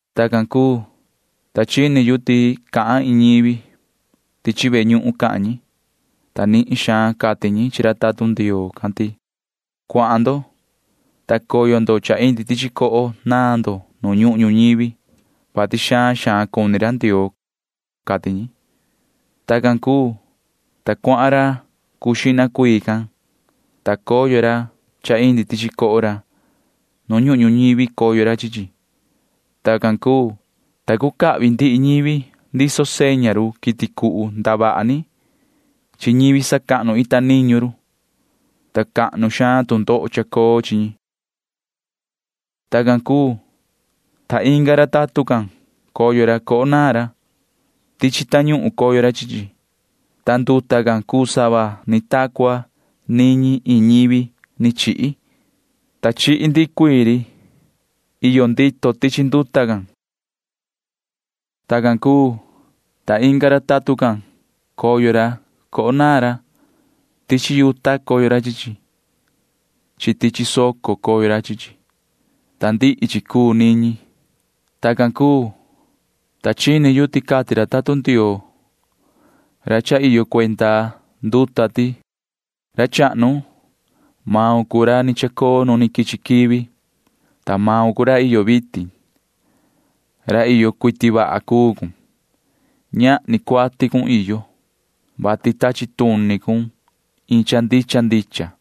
Tacan cuu, ta chini yu ti cahan iin ñivi. Tichi ve ñuhun cahan ñi, ta nihin xaan cati ñi chi ra tatun Ndioo can ti: ―Cuahan ndo, ta coyo ndo cha indi tichi coho naan ndo nu ñuhun ñuñivi, vati xaan xaan cuni ra Ndioo ―cati ñi. Tacan cuu, ta cuahan ra cuu xihna cuii, ta coyo ra cha indi tichi coho ra. Nu ñuhun ñuñivi coyo ra chi chi. Tacan cuu, ta cucahvi ndihi ñivi ndiso seña ri quiti cuhu ndavaha ni chi ñivi sacahnu ita niñu ri, ta cahnu xaan tu ndoho chacoo chi ñi. Tacan cuu, ta inga ra tatun can coyo ra coho naan ra. Tichi tañuhun coyo ra chi chi, ta nduta can cuu sava ni ta cua niñi iin ñivi ni chihi, ta chihi ndihi cuii ri cha iyo ndito tichi nduta can. Tacan cuu, ta inga ra tatun can coyo coho naan ra. Tichi yuta coyo ra chi chi. Tichi soco coyo ra chi chi, ta niñi cuu nduta can. Tacan cuu, ta chini yu ti cati ra tatun Ndioo ra cha iyo cuenda nduta ti: ―Yoho ra chahnu, maun cuu ra ni chacoo nu quichi quivi, ta maun cuu ra iyo vitin. Ra iyo cuiti vaha cuu cun. Ñahni cuati cun iyo, vati tachi tuni cun iin cha ndicha ndicha.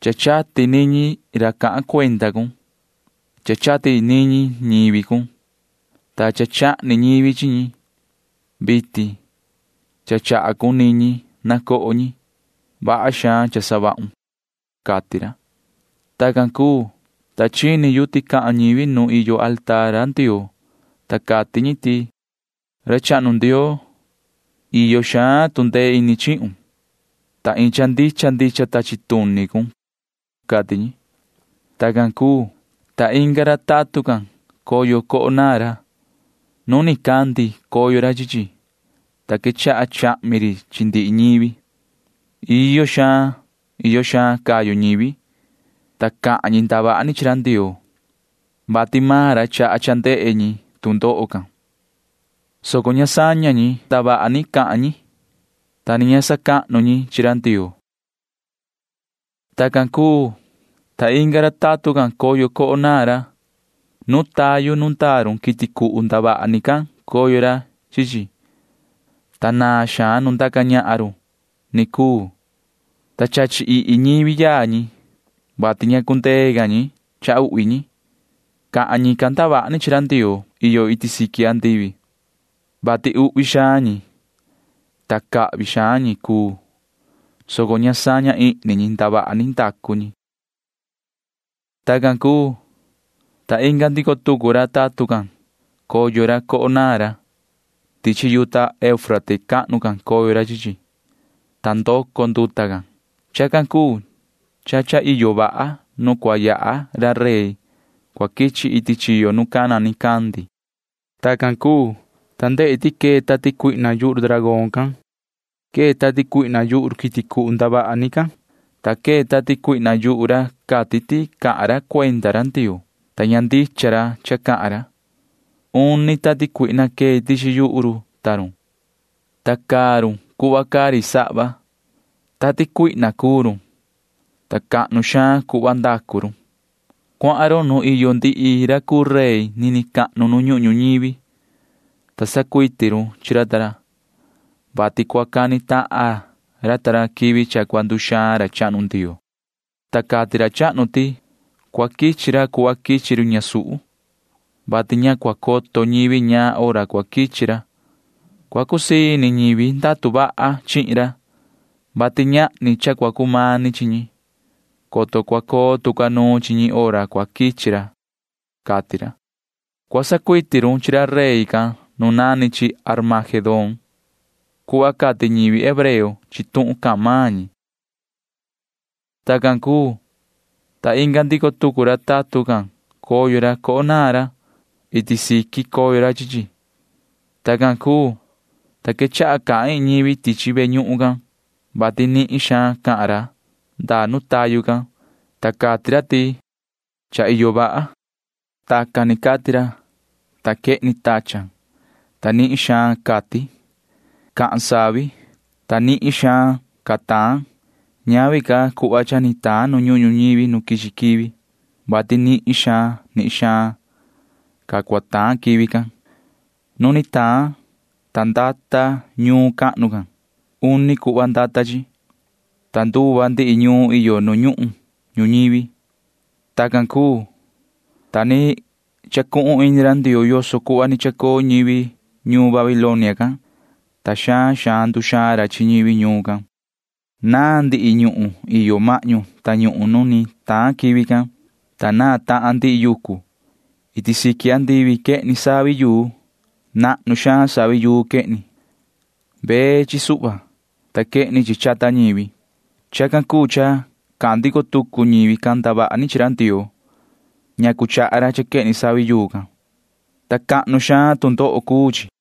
Cha chati niñi ra cahan cuenda cun. Cha chati niñi ñivi cun, ta chahni ñivi chi ñi. Vitin cha chaha cun niñi na coho ñi. Vaha xaan cha savahun ―cati ra. Tacan cuu, ta chini yu ti cahan ñivi nu iyo mesa ra Ndioo, ta cati ñi ti: ―Yoho ra chahnu Ndioo, iyo xaan tu ndee ini chihun, ta iin cha ndicha ndicha tachi tuni cun ―cati ñi. Tacan cuu, ta inga ra tatun can coyo coho naan ra. Nu nicandi coyo ra chi chi, ta quechaha chahmi ri chi ndihi ñivi. Iyo xaan iyo xaan cayu ñivi, ta cahan ñi ndavaha ni chi ra Ndioo, vati maan ra chaha cha ndehe ñi tu ndoho can, soco ña saña ñi ndavaha ni cahan ñi, ta ni ña sacahnu ñi chi ra Ndioo. Tacan cuu, ta inga ra tatun can coyo coho naan ra. Tayu nu ndaa run quiti cuhu ndavaha ni can coyo ra chi chi, ta naan xaan nu ndaca ñahan run ni cuu, ta chachi ihi ñivi yaa ñi, vati ña cundee ca ñi cha uhvi ñi. Cahan ñican ndavaha ni chi ra Ndioo iyo iti andivi, vati uhvi xaan cuni ñi, ta cahvi xaan ñi cuu, soco ña saña ihni ñi ndavaha ni ndacu ñi. Tacan cuu, ta inga ndico tucu ra tatun can coyo ra coho naan ra. Tichi yuta Eufrate cahnu coyo ra chi chi, ta ndoco nduta can. Chacan cuu cha iyo vaha nu cua yaha ra rey cua quichi iti chiyo nu cana nicandi. Tacan cuu, ta ndehi ti quee tati cuihna yuhu ri dragón can. Quee tati cuihna yuhu ri quiti cuhu ndavaha ni can, ta quee tati cuihna yuhu ra cati ti cahan ra cuenda ra Ndioo, ta ña ndicha ra cha cahan ra. Uni tati cuihna quee tichi yuhu run ta run, ta caa run cuhva caa ri sahva. Tati cuihna cuu run, ta cahnu xaan cuhva ndacu run. Cuahan run nu iyo ndihi ra cuu rey ndaca ñahan nini cahnu nu ñuhun ñuñivi, ta sacuiti run chi ra ta ra, vati cua cani tahan ra ta ra quivi cha cua nduxaan ra chahnu Ndioo. [Ta cati ra chahnu ti] cua quichi ra cuhva quichi run ñasuhu, [vati ña cua coto ñivi ñaan hora cua quichi ra]. Cua cusii ini ñivi ndatu vaha chihin ra, vati ñahni cha cua cumani chi ñi, coto cua coo tu ca nuun chi ñi hora cua quichi ra, cati ra. Cua sacuiti run chi ra rey can nu nani chi Armagedón cuhva cati ñivi hebreo chi tuhun cahan maan ñi. Tacan cuu, ta inga ndico tucu ra tatun can coyo ra coho naan ra. Iti siqui coyo ra chi chi. Tacan cuu, ta quechaha cahan iin ñivi tichi ve ñuhun can, vati nihin xaan cahan ra ndaa nu tayu can, ta cati ra ti: ―Cha iyo vaha. Tacan ni cati ra, ta quehni tachan, ta nihin xaan catin. Cahan savi, ta nihin xaan ca taan. Ñavi ca cuhva cha ni taan nu ñuhun ñuñivi nu ni quichi quivi, vati nihin xaan nihin xaan ca taan quivi can. Nu ni taan, ta ndata ñuun cahnu can. Uni cuhva ndata chi, ta nduva ndihi ñuun iyo nu ñuhun ñuñivi. Tacan cuu, ta ni chacuhun ini ra Ndioo yoso cuhva ni chacoo ñivi ñuun Babilonia can, ta xaan xaan nduxaan ra chi ñivi ñuun can. Naan ndihi ñuhun iyo mahñu tañuhun nu ni taan quivi can, ta naan tahan ndihi yucu. Iti siqui andivi quehni savi yuu. Nahnu xaan savi yuu quehni. Vee chi suhva, ta quehni chi chata ñivi. Chacan cuu cha cahan ndico tucu ñivi ndavaha ni chi ra Ndioo, vati chaha ra cha quehni savi yuu can, ta cahnu xaan tu ndoho cuu chi.